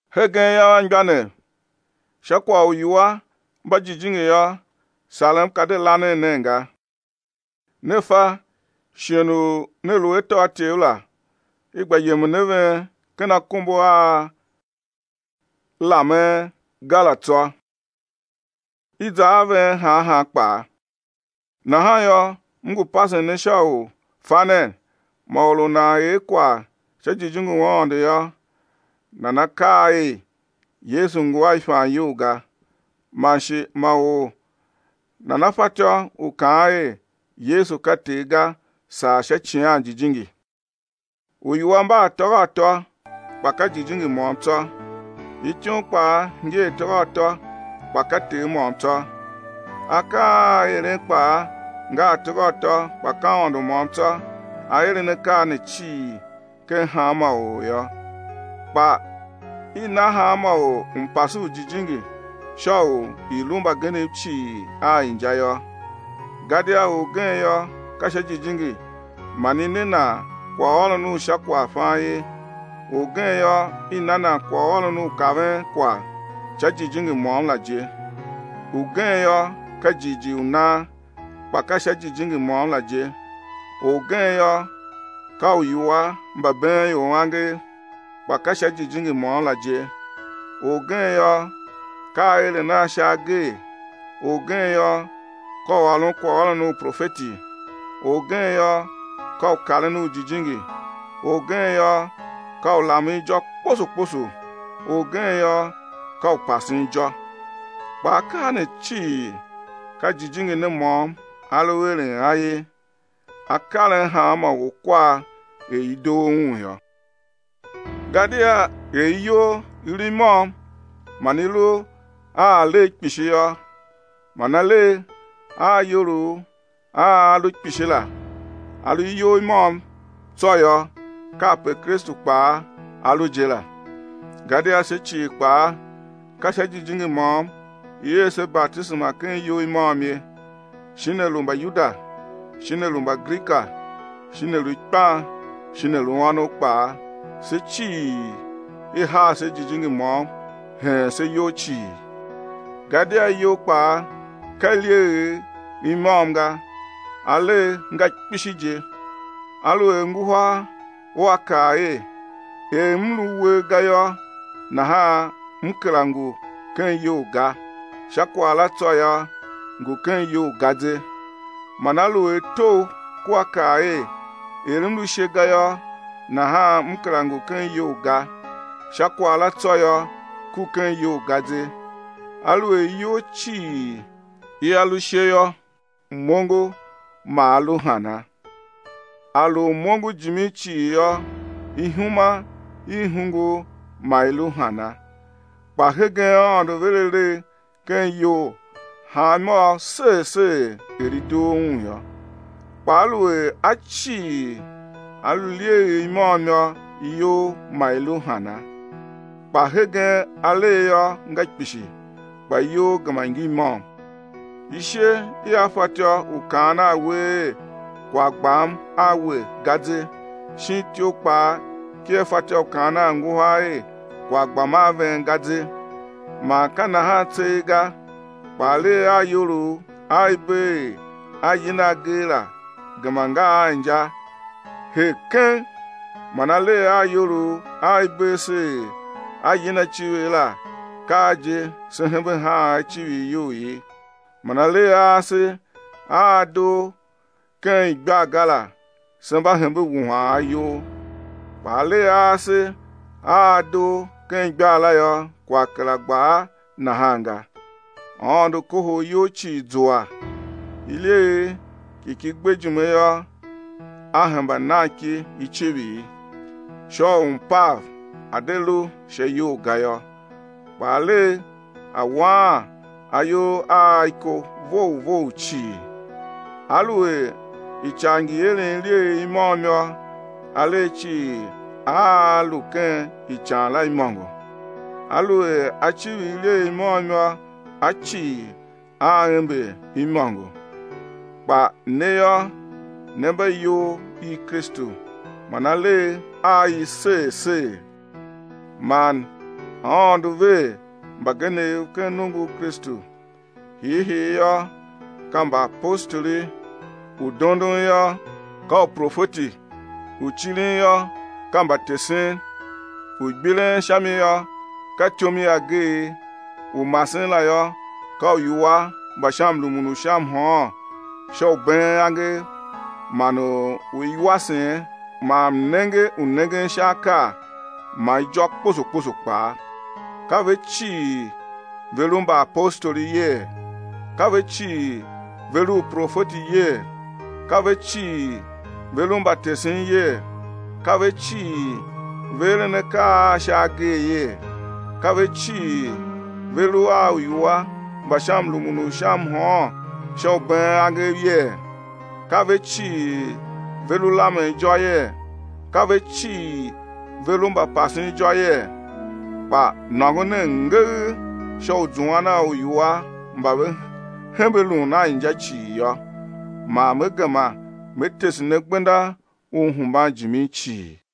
Hegen yô, anmgbianev, sha kwagh u uiwua mba jijingi yô, sarem ka de lanen nen ga. Ne fa, shighe u ne lu atôatyev la, i gba yemen a ven ken akombo a lamen ga la tsô, i za a ven han han kpaa. Nahan yô, m ngu pasen ne sha u fa nen, ma or u nan er kwagh sha Jijingi u Aôndo yô, nana kaa er: Yesu ngu a ifan iyol ga, man shi ma or nana fatyô u kaan er: Yesu ka Ter ga; saa sha Icighan Jijingi. Uiwua mba atôghatô kpa ka Jijingi môm tsô. Ityom kpaa ngi atôghatô, kpa ka Ter môm tsô. Akaa a eren kpaa nga atôghatô kpa ka Aôndo môm tsô A eren akaa ne cii ken hanma or ye. Kpa i na hanma or mpase u Jijingi sha u i̱ lu mbagenev cii a inja yô. Gadia orgen yô, ka sha Jijingi man i ne nan kwaghôron u sha kwaghfan ye, orgen yô, i na nan kwaghôron u kaven kwagh, sha Jijingi môm la je. Ugen yô, ka jighjigh u nan, kpa ka sha Jijingi môm la je; orgen yô, ka uiwua mba been ior angev, kpa ka sha Jijingi môm la je. Orgen yô, ka aeren a sha agee, orgen yô, ka u ôron kwaghôron u profeti, orgen yô, ka u karen ujijingi, orgen yô, ka u lamen ijô kposo kposo, orgen yô, ka u pasen ijô. Kpa akaa ne cii ka Jijingi ne môm A lu eren a ye, A karen hanma or kwar er i doo Un yô. Gadia er iyol i lu i môm man i lu a alegh kpishi yô, man alegh a iyolough a a lu kpishi la, a lu iyol i môm tsô yô, kape Kristu kpaa A lu je la. Gadia se cii kpaa, ka sha Jijingi môm i er se batisema ken iyol i môm ye, shin a lu Mbayuda, shin a lu Mbagrika, shin a lu ikpan shin a lu ônov kpaa, se cii i haa se Jijingi môm, heen se iyol cii. Gadia iyol kpaa ka ilyeegh i môm ga, alegh nga kpishi je. Aluer nguhar ua kaa er: Er m lu uwegh ga yô, nahan m kera ngu ken iyol ga; sha kwagh la tsô yô, ngu ken iyol ga ze. Man aluer togh kua kaa er: Er m lu ishe ga yô, nahan m kera ngu ken iyol ga; sha kwagh la tsô yô, ku ken iyol ga ze. Aluer iyol cii ia lu ishe yô, m-ongo ma a lu hana? A lu m-ongo jimin cii yô, ihuma i hungul ma i lu hana? Kpa hegen Aôndo ver alegh ken iyol hanmôgh ser ser er i doo Un yô. Kpa aluer a cii a lu ilyeegh i môm yô, iyol ma i lu hana? Kpa hegen alegh yô, nga kpishi, kpa iyol gema ngi môm. Ishe ia fatyô u kaan a uwegh er: Kwagh gbam a we ga, ze; shin ityough kpaa kia fatyô u kaan a angahar er: kwagh gbam a ven ga, ze. Man ka nahan tseegh ga, kpa alegh a iyolough a i bee er a yina agee la gema nga a inja her keng. Man alegh a iyolough a i bee se er a yina icivir la, ka a je se hembe haan a icivir iyol ye, man alegh a ase a a doo ken igbar ga la, se mba hembe wuhan a iyol. Kpa alegh a ase a a doo ken igbar la yô, kwagh kera gba a nahan ga. Aôndo kohol iyol cii, zua, ilyeegh ki ki gbe ijime yô, A hemba nan ki icivir, sha u mpav a̱ de lu sha iyol ga yô, kpa alegh a̱ waan iyol a a iko vough vough cii. Aluer ican ngi eren ilyeegh i môm yô, alegh cii aa lu ken ican la imôngo. Aluer a civir ilyeegh i môm yô, a cii, aa ember imôngo. Kpa ne yô, ne mba iyol i Kristu man alegh a i ser ser. Man Aôndo ver mbagenev ken nongo u Kristu: hiihii yô, ka mbaapostoli, u dondon yô, ka uprofeti u cirin yô ka mbatesen, u gbiren sha mi yô, ka ityom i ageegh, u masen la yô, ka uiwua mba sha mrumun u sha mhôôn sha u been angev, man uiwasen man mnenge u nengen sha akaa, man ijô kposo kposo kpaa. Ka ve cii ve lu mbaapostoli yee? Ka ve cii ve lu uprofeti yee? Ka ve cii ve lu mbatesen yee? Ka ve cii ve eren akaa a sha agee yee? Ka ve cii ve lu a uiwua mba sha mrumun u sha mhôôn sha u been angev yee? Ka ve cii ve lu lamen ijô yee? Ka ve cii ve lu mbapasen ijô yee? Kpa nôngo nen ngegh sha u zuan a uiwua mba ve hembe lun a inja cii yô; man me gema me tese ne gbenda u hemban jimin cii.